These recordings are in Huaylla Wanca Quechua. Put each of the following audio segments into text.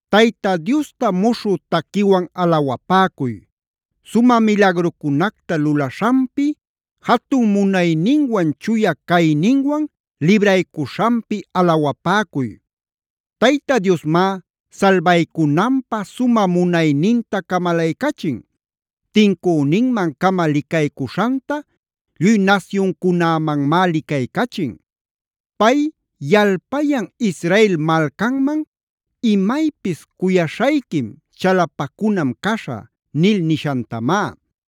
Tayta Diosta muśhü taquiwan alawapäcuy. Sumä milagrucunacta lulaśhanpi, jatun munayninwan chuya cayninwan libraycuśhanpi alawapäcuy. Tayta Diosmá salbaycunanpä sumä munayninta camalaycachin. Tincüninman-cama licaycuśhanta lluy nasyuncunämanmá licaycachin. Pay yalpayan Israel malcanman: “Imaypis cuyaśhayquim, chalapacunam caśhä” nil nishantamá.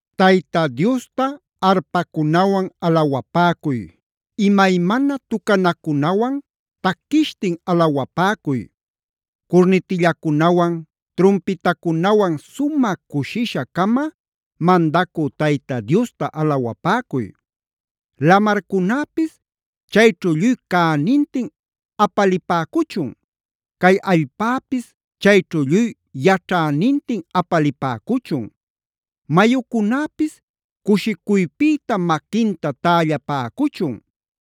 Tayta Diosta arpacunawan alawapäcuy. Imaymana tucanacunawan taquishtin alawapäcuy. Curnitillacunawan trumpitacunawan sumä cushisha-cama, mandacü Tayta Diosta alawapäcuy. Lamarcunäpis chayćhu lluy cänintin apalipäcuchun. Cay allpäpis chayćhu lluy yaćhänintin apalipäcuchun. Mayucunäpis cushicuypïta maquinta tällapäcuchun.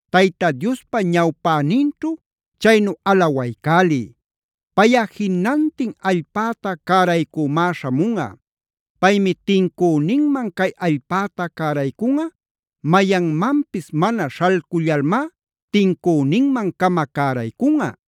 Tayta Diospa ñawpäninćhu chaynu alawaycäliy. Payꞌa jinantin allpäta cäraycümá śhamunꞌa. Paymi tincüninman cay allpäta cäraycunꞌa, mayanmanpis mana śhalcullalmá tincüninman-cama cäraycunꞌa.